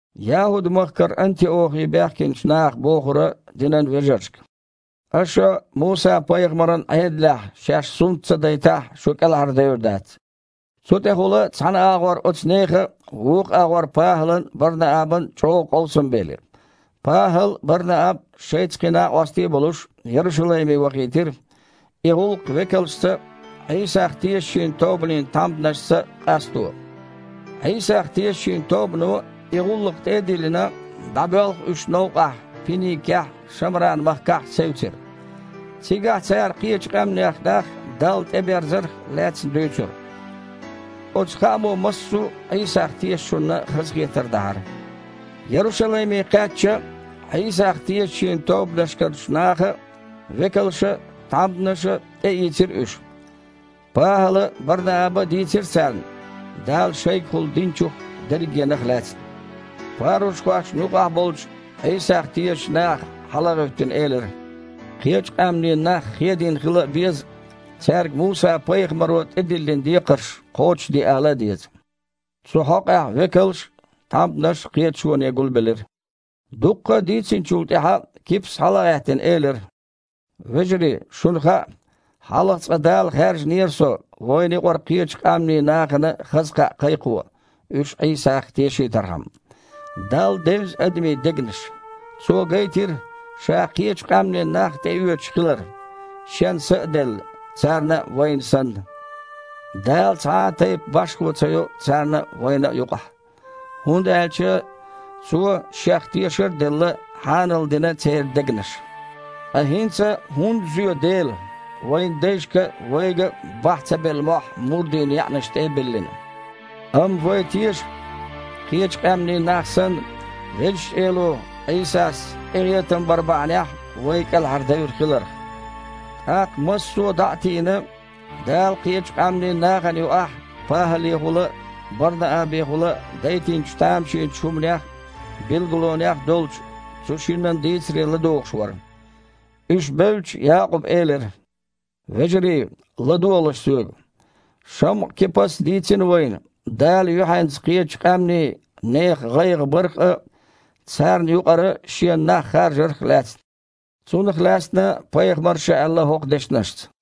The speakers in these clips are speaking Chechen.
ЯхІуд-махкара Антиохе баьхкинчу наха бохура динан вежаршка: «Аша Муса-пайхамаран Іедалехь шаьш сунт ца дайтахь, шу кІелхьардевр дац». Цу тІехула цхьана агІор оцу нехан а, вукху агІор ПахІалан а, Бар-Наабан а чІогІа къовсам белира. ПахІал а, Бар-Нааб а, шайца кхин накъостий а болуш, Ярушалайме вахийтира, и гІуллакх векалшца а, Іийсах тешачийн тобанийн тхьамданашца а къасто. Іийсах тешачийн тобано и гІуллакх тІе а диллина, дІабоьлху уьш новкъахь, Пиникехь а, Шамран-махкахь а, севцира. Цигахь цара кхечу къаьмнех нах Далла тІеберзарх лаьцна дуьйцура. Оцу хаамо массо а Іийсах тешачунна хазахетар дахьара. Ярушалайме кхаьчча, Іийсах тешачийн тобанашкарчу наха а, векалша а, тхьамданаша а тІеийцира уьш. ПахІала а, Бар-Нааба а дийцира царна Дала шайгахула динчух дерригенах а лаьцна. Парушхошна юкъахь болчу Іийсах тешачу наха, хьала а гІевттина, элира: «Кхечу къаьмнийн нах хедийна хила а беза, цаьрга Муса-пайхамаро тІедиллина декхарш кхочушде ала а деза». Цу хьокъехь векалш а, тхьамданаш а кхеташоне гулбелира. Дуккха а дийцинчул тІаьхьа Кипас, хьала а гІаьттина, элира: «Вежарий, шуна хаьа, хьалха цкъа Дала хаьржинера со вайна юкъара кхечу къаьмнийн нахана хаза кхаъ кхайкхо, уьш Іийсах тешийтархьама. Далла девза адамийн дегнаш. Цо гайтира, Ша кхечу къаьмнийн нах тІеоьцуш хилар, Шен Са а делла, царна а, вайна санна. Дала цхьа а тайпа башхо ца йо царна а, вайна а юкъахь, хІунда аьлча Цо, Шех тешар а делла, хьаналдина церан дегнаш. Ткъа хІинца хІунда зоь Дела, вайн дайшка а, вайга а бахьа ца белла мохь мурдийн яьІнаш тІе а биллина? Амма вай теша, кхечу къаьмнийн нах санна, Везачу Эло Іийсас къинхетам бар бахьанехь вай кІелхьардевр хиларх». ТІаккха массо а, дІа а тийна, Дала кхечу къаьмнийн нахана юкъахь ПахІалехула а, Бар-Наабехула а дайтинчу тамашийначу хІуманех а, билгалонех а долчу цу шиннан дийцаре ладугІуш вара. Уьш бевлча, Якъуба элира: «Вежарий, ладогІалаш соьга. ШамІа-Кипас дийцина вайна Дала юьхьанца кхечу къаьмнийн нехан гІайгІа барх а, царна юкъара Шена нах харжарх а лаьцна. Цунах лаьцна пайхамарша а аьлла хІокху дешнашца: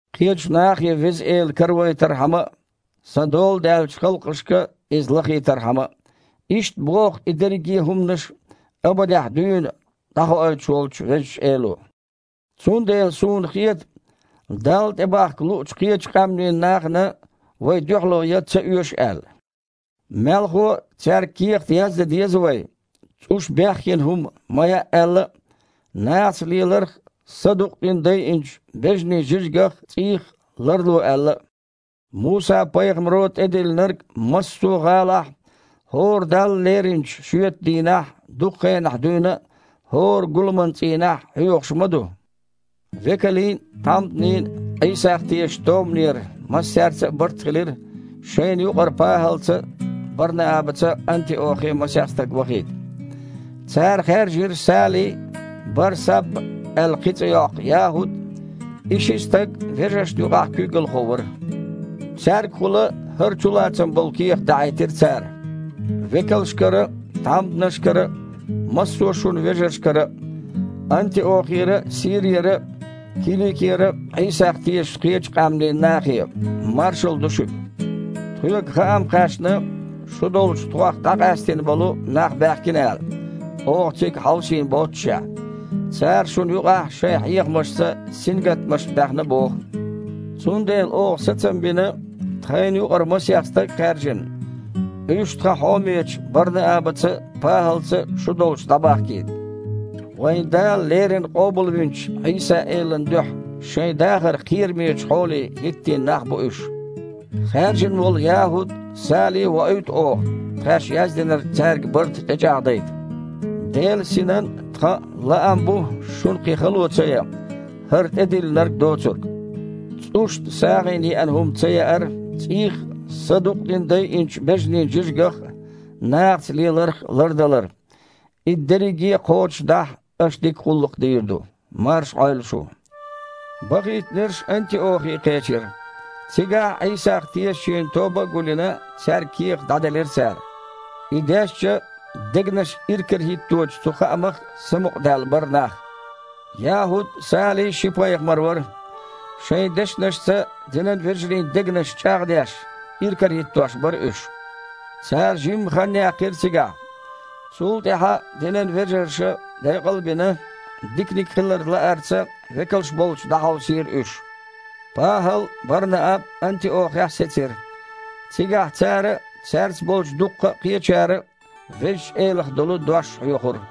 кхечу нахе Веза Эла каравайтархьама а, Сан дола даьллачу халкъашка Иза лахийтархьама а. Иштта боху и дерриге а хІуманаш абадехь дуьйна дІахоуьйтуш волчу Везачу Эло“. Цундела суна хета, Далла тІе бахка луучу кхечу къаьмнийн нахана вай дуьхьало ян ца оьшу аьлла. Мелхо а, цаьрга кехат яздан деза вай, цІуша бехйина хІума ма яа аьлла а, нахаца леларх а, садукъдина дайинчу бежанийн жижигах а, цІийх а ларло аьлла а. Муса-пайхамаро тІедиллинарг массо а гІалахь хІора Далла леринчу шоьтан дийнахь дукха хенахь дуьйна а хІора гуламан цІийнахь хьоьхуш ма ду». Векалийн а, тхьамданийн а Іийсах тешачу тобанера массаьрца а барт хилира шайна юкъара ПахІалца а, Бар-Наабаца а Антиохе масех стаг вахийта. Цара хаьржира Сали а, Бар-Сабба аьлла кхин цІе йоккху ЯхІуд а. И ши стаг вежаршна юкъахь куьйгалхо вара. Цаьргахула хІара чулацам болу кехат дахьийтира цара: «Векалшкара а, тхьамданашкара а, массо а шун вежаршкара а. Антиохера а, Сирера а, Киликера Іийсах тешачу кхечу къаьмнийн нахе. Маршалла ду шуьга! Тхоьга хаам кхаьчна, шу долчу тхох дІакъаьстина болу нах баьхкина аьлла, оха цига хьовсийна боццушехь. Цара шуна юкъахь шайн хьехамашца сингаттамаш баьхна боху. Цундела оха сацам бина, тхайна юкъара масех стаг а хаьржина, уьш тхан хьомечу Бар-Наабаца а, ПахІалца а шу долчу дІабахкийта. Вайн Дала леррина къобалвинчу Іийса-Элан дуьхьа шайн дахар кхерамечу хьоле хІиттийна нах бу уьш. Хаьржина волу ЯхІуд а, Сали а воуьйту оха, тхаьш яздинарг цаьрга барта тІечІагІдайта. Делан Синан а, тхан а лаам бу шуна кхин хало ца ян, хІара тІедиллинарг доцург: ЦІушна сагІина еана хІума ца яар, цІийх а, садукъдина дайинчу бежанийн жижигах а, нахаца леларх а лардалар. И дерриге а кхочушдахь, аша дика гІуллакх дийр ду. Марша Іойла шу!» Бахийтинарш Антиохе кхечира. Цигахь, Іийсах тешачийн тоба гул а йина, цаьрга кехат дІаделира цара. И дешча, дегнаш иракарахІитточу цу хаамах самукъадаьлла бара нах. ЯхІуд а, Сали а ши пайхамар вара. Шайн дешнашца динан вежарийн дегнаш чІагІдеш, иракарахІиттош бара уьш. Цара жимма хан яьккхира цигахь. Цул тІаьхьа динан вежарша, декъал а бина, диканиг хилар лаарца векалш болчу дІахьовсийра уьш. ПахІал а, Бар-Нааб а Антиохехь сецира. Цигахь цара а, цаьрца болчу дуккха а кхечара а Везачу Элах долу дош хьоьхура.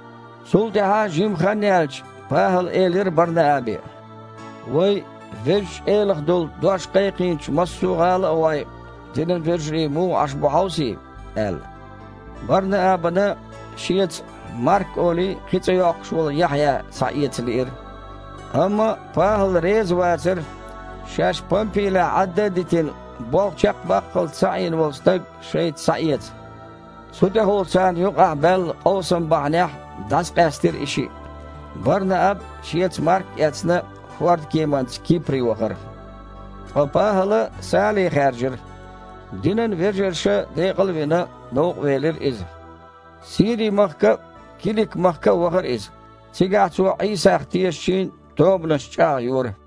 Цул тІаьхьа жимма хан яьлча, ПахІала элира Бар-Наабе: «Вай Везачу Элах долу дош кхайкхийначу массо а гІала а гІой, динан вежарий муха Іаш бу хьовсий», – аьлла. Бар-Наабана шеца, Марк олий, кхин цІе йоккхуш волу Яхьъя схьаэца лиира. Амма ПахІал реза вацара, шаьш Пампилехь Іадда а дитина, болх чекхбаккхалц ца Іийна волу стаг шайца схьаэца. Цу тІехула царна юкъахь баьлла къовсам бахьанехь дІасакъаьстира и шиъ. Бар-Нааб, шеца Марк а эцна, хІордкеманца Кипре вахара. Ткъа ПахІала Сали хаьржира. Динан вежарша декъал а вина, новкъа велира иза. Сири-махка а, Килик-махка а вахара иза. Цигахь цо Іийсах тешачийн тобанаш чІагІйора.